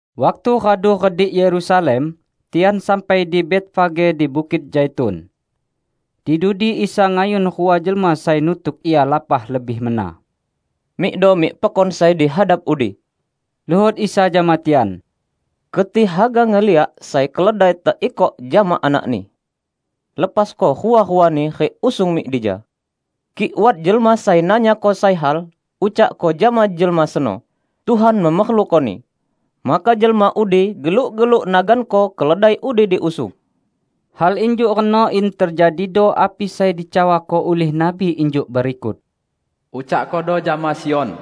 Waktu radu redik Yerusalem, tian sampai di Betfage di Bukit Zaitun. Di dudi Isa ngayun rua jelma sai nutuk Ia lapah lebih mena. "Mikdo mik pekon sai dihadap udi," luhot Isa jama tian. "Keti haga ngeliak sai keledai teikok jama anakni. Lepasko rua-ruani rik usung mik dija. Kik wat jelma sai nanyako sai hal, ucakko jama jelma seno, 'Tuhan memerlukoni', maka jelma udi geluk-geluk naganko keledai udi diusung." Hal injuk reno in tejadido api sai dicawako ulih nabi injuk berikut, "Ucakkodo jama Sion,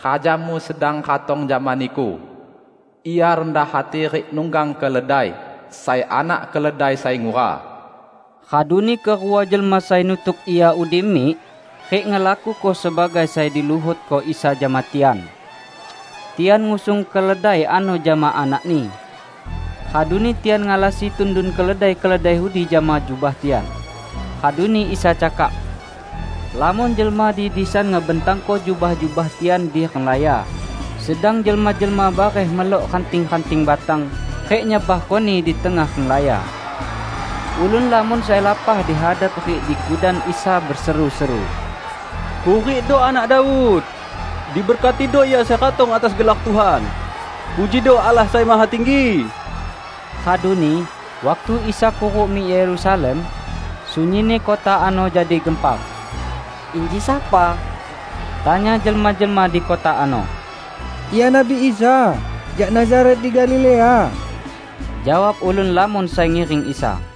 Rajamu sedang ratong jama niku. Ia rendah hati rik nunggang keledai, sai anak keledai sai ngura." Raduni kerua jelma sai nutuk Ia udi mik rik ngelakuko sebagai sai diluhotko Isa jama tian. Tian ngusung keledai ano jama anakni. Raduni tian ngalasi tundun keledai-keledai udi jama jubah tian. Raduni Isa cakak. Lamon jelma di disan ngebentangko jubah-jubah tian di renglaya, sedang jelma-jelma bareh melok ranting-ranting batang rik nyebarkoni di tengah renglaya. Ulun lamon sai lapah di hadap rik di kudan Isa beseru-seru, "Hurikdo Anak Daud! Diberkatido Ia sai ratong atas gelar Tuhan! Pujido Allah Sai Mahatinggi!" Raduni, waktu Isa kuruk mik Yerusalem, sunyinni kota ano jadi gempar. "Inji sapa?" tanya jelma-jelma di kota ano. "Ia Nabi Isa, jak Nazaret di Galilea," jawab ulun lamon sai ngiring Isa.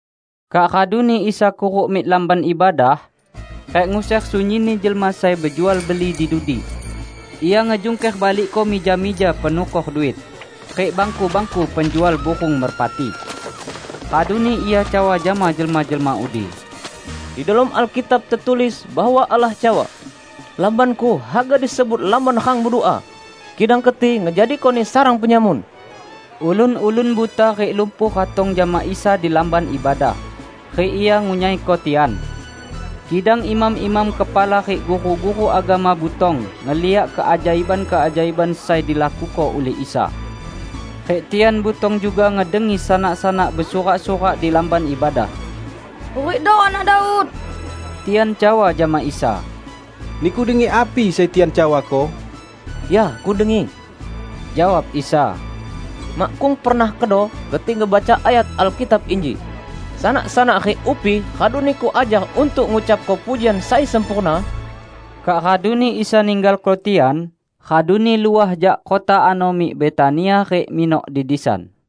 Kak raduni Isa kuruk mik Lamban Ibadah, rik nguser sunyinni jelma sai bejual beli di dudi. Ia ngejungker balikko mija-mija penukor duit, rik bangku-bangku penjual burung merpati. Raduni Ia cawa jama jelma-jelma udi, "Di delom Alkitab tetulis bahwa Allah cawa, 'Lamban-Ku haga disebut lamban rang bedua.' Kidang keti ngejadikoni sarang penyamun!" Ulun-ulun buta rik lumpuh ratong jama Isa di Lamban Ibadah, rik Ia ngunyaiko tian. Kidang imam-imam kepala rik guru-guru agama butong ngeliak keajaiban-keajaiban sai dilakuko ulih Isa. Rik tian butong juga ngedengi sanak-sanak besurak-surak di Lamban Ibadah, "Hurikdo Anak Daud!" Tian cawa jama Isa, "Niku dengi api sai tian cawako?" "Ya, Kudengi," jawab Isa. "Makkung pernah kedo keti ngebaca ayat Alkitab inji: 'Sanak-sanak rik upi radu Niku ajar untuk ngucapko pujian sai sempurna'?" Kak raduni Isa ninggalko tian, raduni luah jak kota ano mik Betania rik minok di disan.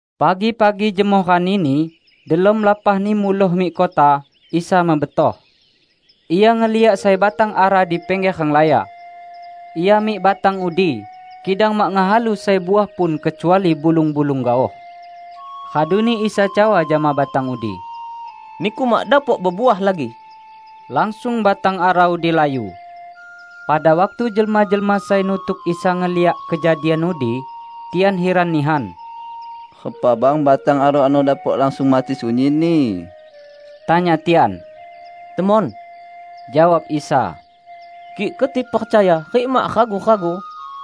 Pagi-pagi jemoh ranini, delom lapahni muloh mik kota, Isa mebetoh. Ia ngeliak sai batang ara di pingger renglaya. Ia mik batang udi, kidang mak ngehalu sai uah pun kecuali bulung-bulung gaoh. Raduni Isa cawa jama batang udi, "Niku mak dapok bebuah lagi!" Langsung batang ara udi layu. Pada waktu jelma-jelma sai nutuk Isa ngeliak kejadian udi, tian hiran nihan. "Repa bang batang ara ano dapok langsung mati sunyinni?" tanya tian. "Temon," jawab Isa, "kik keti percaya rik mak ragu-ragu,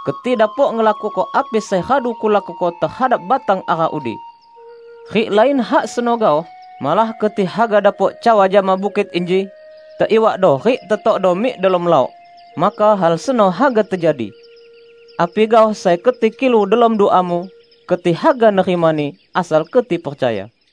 keti dapok ngelakuko api sai radu Kulakuko tehadap batang ara udi. Rik lain hak seno gaoh, malah keti haga dapok cawa jama bukit inji, 'Teiwakdo rik tetokdo mik delom laok'; maka hal seno haga tejadi. Api gaoh sai keti kilu delom duamu, keti haga nerimani, asal keti percaya."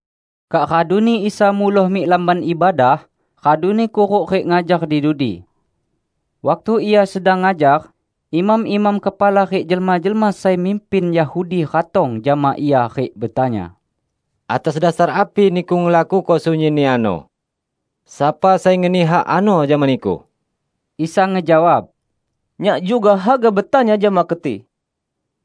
Kak raduni Isa muloh mik Lamban Ibadah, raduni kuruk rik ngajar di dudi. Waktu Ia sedang ngajar, imam-imam kepala rik jelma-jelma sai mimpin Yahudi ratong jama Ia rik betanya, "Atas dasar api Niku ngelakuko sunyinni ano? Sapa sai ngeni hak ano jama Niku?" Isa ngejawab, "Nyak juga haga betanya jama keti.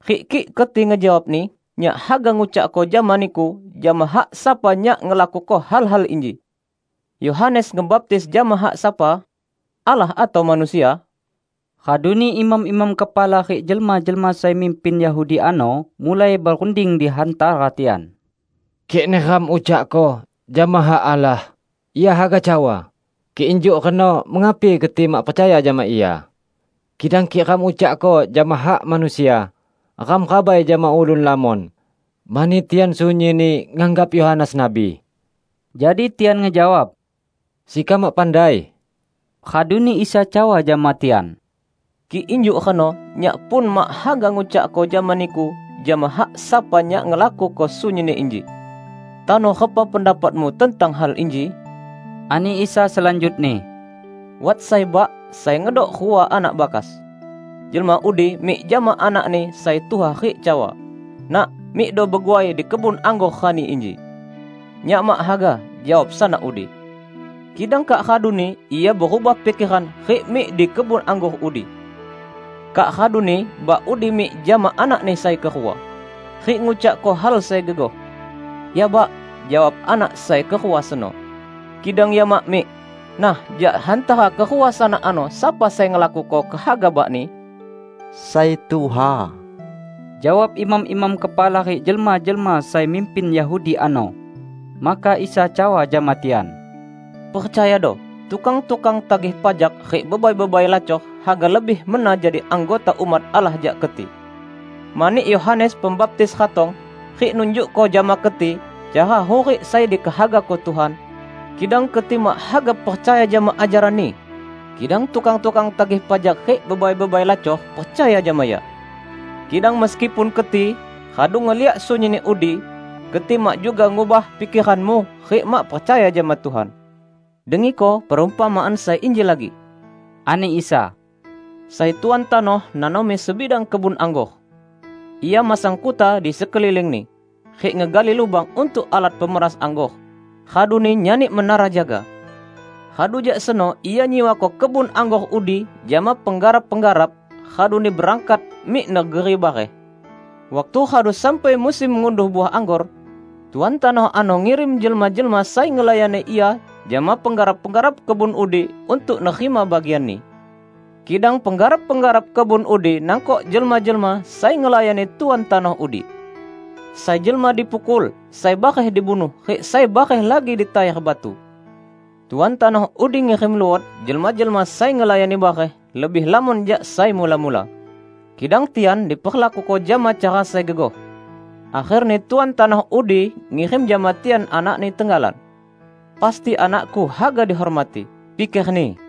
Rik kik keti ngejawabni, Nyak haga ngucakko jama niku jama hak sapa Nyak ngelakuko hal-hal inji. Yohanes ngebaptis jama hak sapa? Allah atau manusia?" Raduni imam-imam kepala rik jelma-jelma sai mimpin Yahudi ano mulai berunding di hantara tian, "Kik neram ucakko, 'Jama hak Allah,' Ia haga cawa, 'Kik injuk reno mengapi keti mak percaya jama ia?' Kidang kik ram ucakko, 'Jama hak manusia,' ram rabai jama ulun lamon, mani tian sunyinni nganggap Yohanes nabi." Jadi tian ngejawab, "Sekam mak pandai." Raduni Isa cawa jama tian, "Kik injuk reno Nyak pun mak haga ngucakko jama niku jama hak sapa Nyak ngelakuko sunyinni inji." "Tano repa pendapatmu tentang hal inji?" ani Isa selanjutni. "Wat sai bak sai ngedok rua anak bakas. Jelma udi mik jama anakni sai tuha rik cawa, 'Nak, mikdo beguai di kebun anggor rani inji.' 'Nyak mak haga,' jawab sanak udi. Kidang kak raduni ia berubah pikeran rik mik di kebun anggor udi. Kak raduni bak udi mik jama anakni sai kerua, rik ngucakko hal sai gegoh. 'Ya, Bak,' jawab anak sai kerua seno. Kidang ia mak mik. Nah, jak hantara kerua sanak ano, sapa sai ngelakuko kehaga bakni?" "Sai tuha," jawab imam-imam kepala rik jelma-jelma sai mimpin Yahudi ano. Maka Isa cawa jama tian, "Percayado: Tukang-tukang tagih pajak rik bebai-bebai lacor haga lebih mena jadi anggota umat Allah jak keti. Mani Yohanes Pembaptis ratong, rik nunjukko jama keti cara hurik sai dikehagako Tuhan, kidang keti mak haga percaya jama ajaranni; kidang tukang-tukang tagih pajak rik bebai-bebai lacor percaya jama ia. Kidang meskipun keti radu ngeliak sunyinni udi, keti mak juga ngubah pikeranmu rik mak percaya jama Tuhan." "Dengiko perumpamaan sai inji lagi," ani Isa. "Sai tuan tanoh nanomi sebidang kebun anggor. Ia masang kuta di sekelilingni, rik ngegali lubang untuk alat pemeras anggor, raduni nyani menara jaga. Radu jak seno ia nyiwako kebun anggor udi jama penggarap-penggarap, raduni berangkat mik negeri bareh. Waktu radu sampai musim ngunduh uah anggor, tuan tanoh ano ngirim jelma-jelma sai ngelayani ia jama penggarap-penggarap kebun udi untuk nerima bagianni. Kidang penggarap-penggarap kebun udi nangkok jelma-jelma sai ngelayani tuan tanoh udi: Sai jelma dipukul, sai bareh dibunuh, rik sai bareh lagi ditayar batu. Tuan tanoh udi ngirim luot jelma-jelma sai ngelayani bareh, lebih lamon jak sai mula-mula. Kidang tian diperlakuko jama cara sai gegoh. Akherni tuan tanoh udi ngirim jama tian anakni tenggalan. 'Pasti anakku haga dihormati,' pikerni.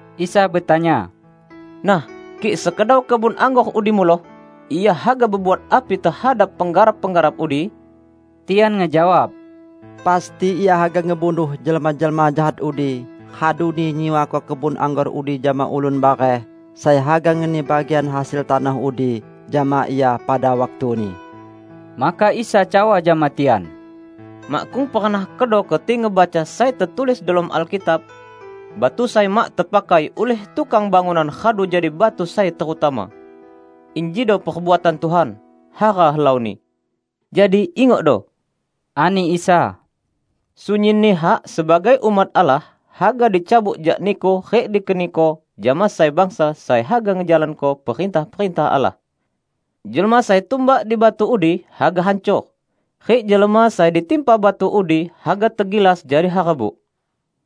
Isa betanya, "Nah, kik sekedau kebun anggor udi muloh, ia haga bebuat api tehadap penggarap-penggarap udi?" Tian ngejawab, "Pasti ia haga ngebunuh jelma-jelma jahat udi, raduni nyiwako kebun anggor udi jama ulun bareh sai haga ngeni bagian hasil tanoh udi jama ia pada waktuni." Maka Isa cawa jama tian, "Makkung pernah kedo keti ngebaca sai tetulis delom Alkitab? 'Batu sai mak tepakai ulih tukang bangunan radu jadi batu sai terutama. Injido perbuatan Tuhan; hara helauni!' " "Jadi ingokdo," ani Isa, "sunyinni hak sebagai umat Allah haga dicabut jak niku rik dikeniko jama sai bangsa sai haga ngejalanko perintah-perintah Allah. [ Jelma sai tumbak di batu udi, haga hancor; rik jelma sai ditimpa batu udi, haga tegilas jadi harbuk.]"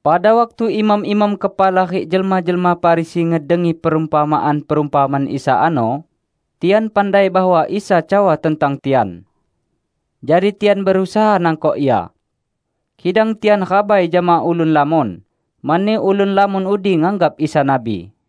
Pada waktu imam-imam kepala rik jelma-jelma Farisi ngedengi perumpamaan-perumpamaan Isa ano, tian pandai bahwa Isa cawa tentang tian. Jadi tian berusaha nangkok Ia. Kidang tian rabai jama ulun lamon, mani ulun lamon udi nganggap Isa nabi.